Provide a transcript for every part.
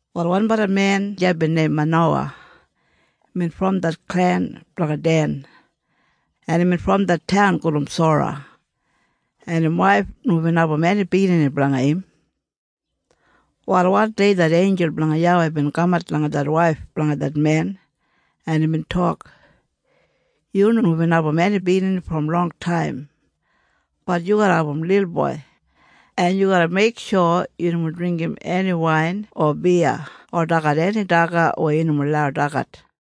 Wal wanbala men deya bin neim Manowa. Imbin brom det klen blanga Den, en imbin brom det taun gulum Sora, en im waif nomo bin abum eni biginini blanga im. Wal wandei det einjul blanga YAWEI bin kamat langa det waif blanga det men, en imbin tok, “Yu nomo bin abum eni biginini brom longtaim. Bat yu garra abum lilboi, en yu garra meiksho yu nomo dringgim eni wain o biya o dagat eni daga weya yu nomo lau dagat,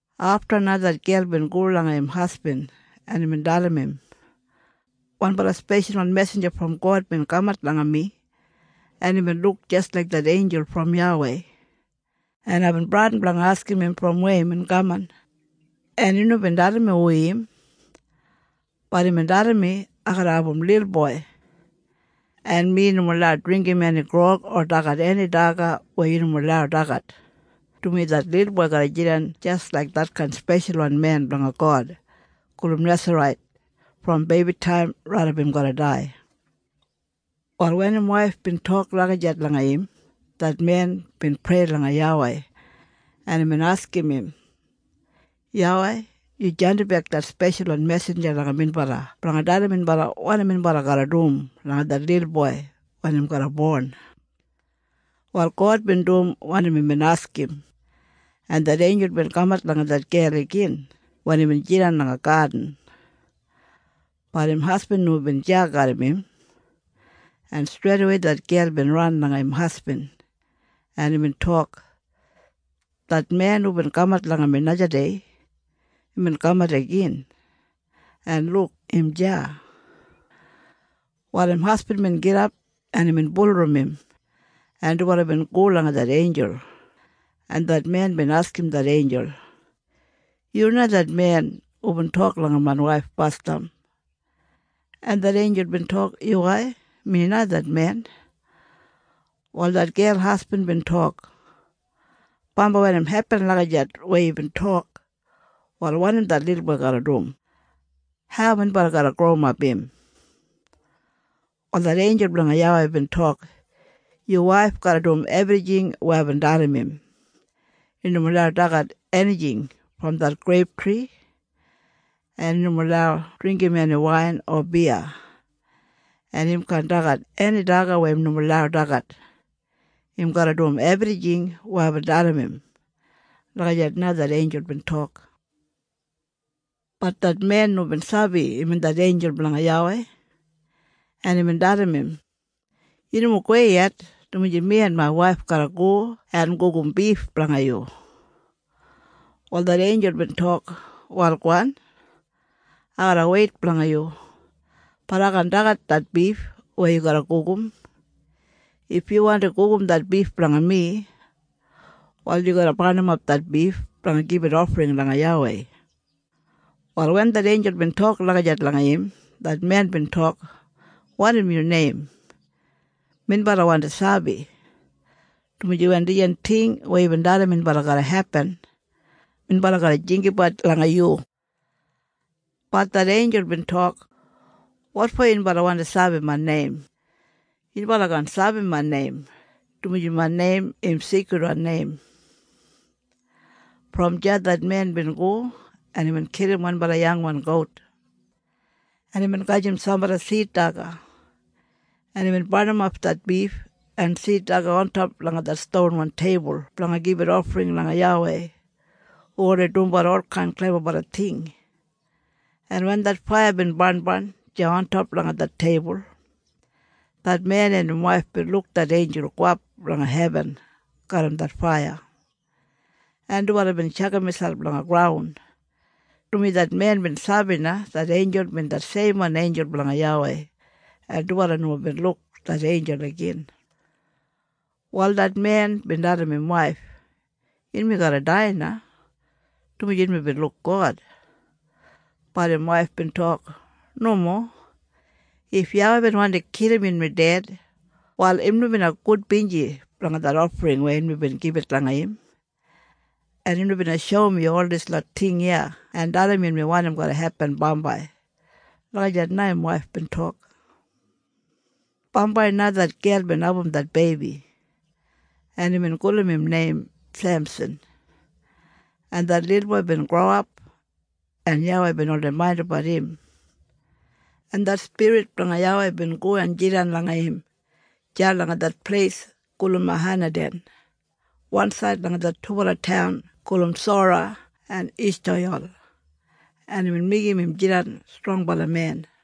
Afta na det gel bin go langa im hasbin, en imbin dalim im, “Wanbala speshalwan mesinja brom God bin kamat langa mi, en imbin luk jis laik det einjul brom YAWEI, en aibin bradin blanga askim im brom weya imbin kaman, en im nomo bin dalim mi hu im. Bat imbin dalim mi ai garra abum lilboi, en mi nomo lau dringgim eni grog o dagat eni daga weya yu nomo lau dagat, dumaji det lilboi garra jidan jis laik detkain speshalwan men blanga God gulum Nesarait brom beibitaim raidap im garra dai.” Wal wen im waif bin tok lagijat langa im, det men bin prei langa YAWEI, en imbin askim im, “YAWEI, yu jandimbek det speshalwan mesinja langa minbala blanga dalim minbala wanim minbala garra dum langa det lilboi wen im garra bon.” Wal God bin dum wanim imbin askim, en det einjul bin kamat langa det gel igin wen imbin jidan langa gadin. Bat im hasbin nomo bin deya garram im, en streidawei det gel bin ran langa im hasbin, en imbin tok, “Det men hubin kamat langa mi najadei, imbin kamat igin, en luk im deya!” Wal im hasbin bin gidap, en imbin bulurrum im, en dubala bin go langa det einjul, en det men bin askim det einjul, “Yu na det men hubin tok langa main waif basdam?” En det einjul bin tok, “Yuwai. Mi na det men.” Wal det gel hasbin bin tok, “Bambai wen im hepin lagijat weya yubin tok, wal wanim det lilboi garra dum? Hau minbala garra growimap im?” Wal det einjul blanga YAWEI bin tok, “Yu waif garra dum ebrijing weya aibin dalim im. Im nomo lau dagat enijing brom det greiptri, en im nomo lau dringgim eni wain o biya, en im kaan dagat eni daga weya im nomo lau dagat. Im garra dum ebrijing weya aibin dalim im.” Lagijat na det einjul bin tok. Bat det men nomo bin sabi imbin det einjul blanga YAWEI, en imbin dalim im, “Yu nomo gowei yet, dumaji mi en main waif garra go en gugum bif blanga yu.” Wal det einjul bin tok, “Wal gowan. Ai garra weit blanga yu. Bat ai kaan dagat det bif weya yu garra gugum. If yu wandi gugum det bif blanga mi, wal yu garra barnimap det bif blanga gibit ofring langa YAWEI.” Wal wen det einjul bin tok lagijat langa im, det men bin tok, “Wanim yu neim? Minbala wandi sabi, dumaji wen dijan ting weya yubin dalim minbala garra hepin, minbala garra jinggabat langa yu.” Bat det einjul bin tok, “Wotfo yunbala wandi sabi main neim? Yunbala kaan sabi main neim, dumaji main neim im sigridwan neim.” Brom deya det men bin go, en imbin kilim wanbala yangwan gout, en imbin gajim sambala sid daga, en imbin barnimap det bif en sid daga ontop langa stonwan teibul blanga gibit ofring langa YAWEI hu oldei dumbat olkain klebabala ting, en wen det faiya bin barnbarn deya ontop langa det teibul, det men en im waif bin luk det einjul gowap langa hebin garram det faiya, en dubala bin tjakam miselp langa graun, dumaji det men bin sabi na det einjul bin det seimwan einjul blanga YAWEI, en dubala nomo bin luk det einjul igin. Wal det men bin dalim im waif, “Yunmi garra dai na, dumaji yunmi bin luk God!” Bat im waif bin tok, “Nomo. If YAWEI bin wandi kilim yunmi ded, wal im nomo bina gudbinji blanga det ofring weya yunmi bin gibit langa im, en im nomo bina shoum yu ol dislot ting iya en dalim yunmi wanim garra hepin bambai.” Lagijat na im waif bin tok. Bambai na det gel bin abum det beibi, en imbin gulum im neim Semsan, en det lilboi bin growap, en YAWEI bin oldei maindimbat im, en det spirit blanga YAWEI bin go en jidan langa im deya langa det pleis gulum Mahaneden wansaid langa det dubala taun gulum Sora en Eshtayol, en imbin meigim im jidan strongbala men.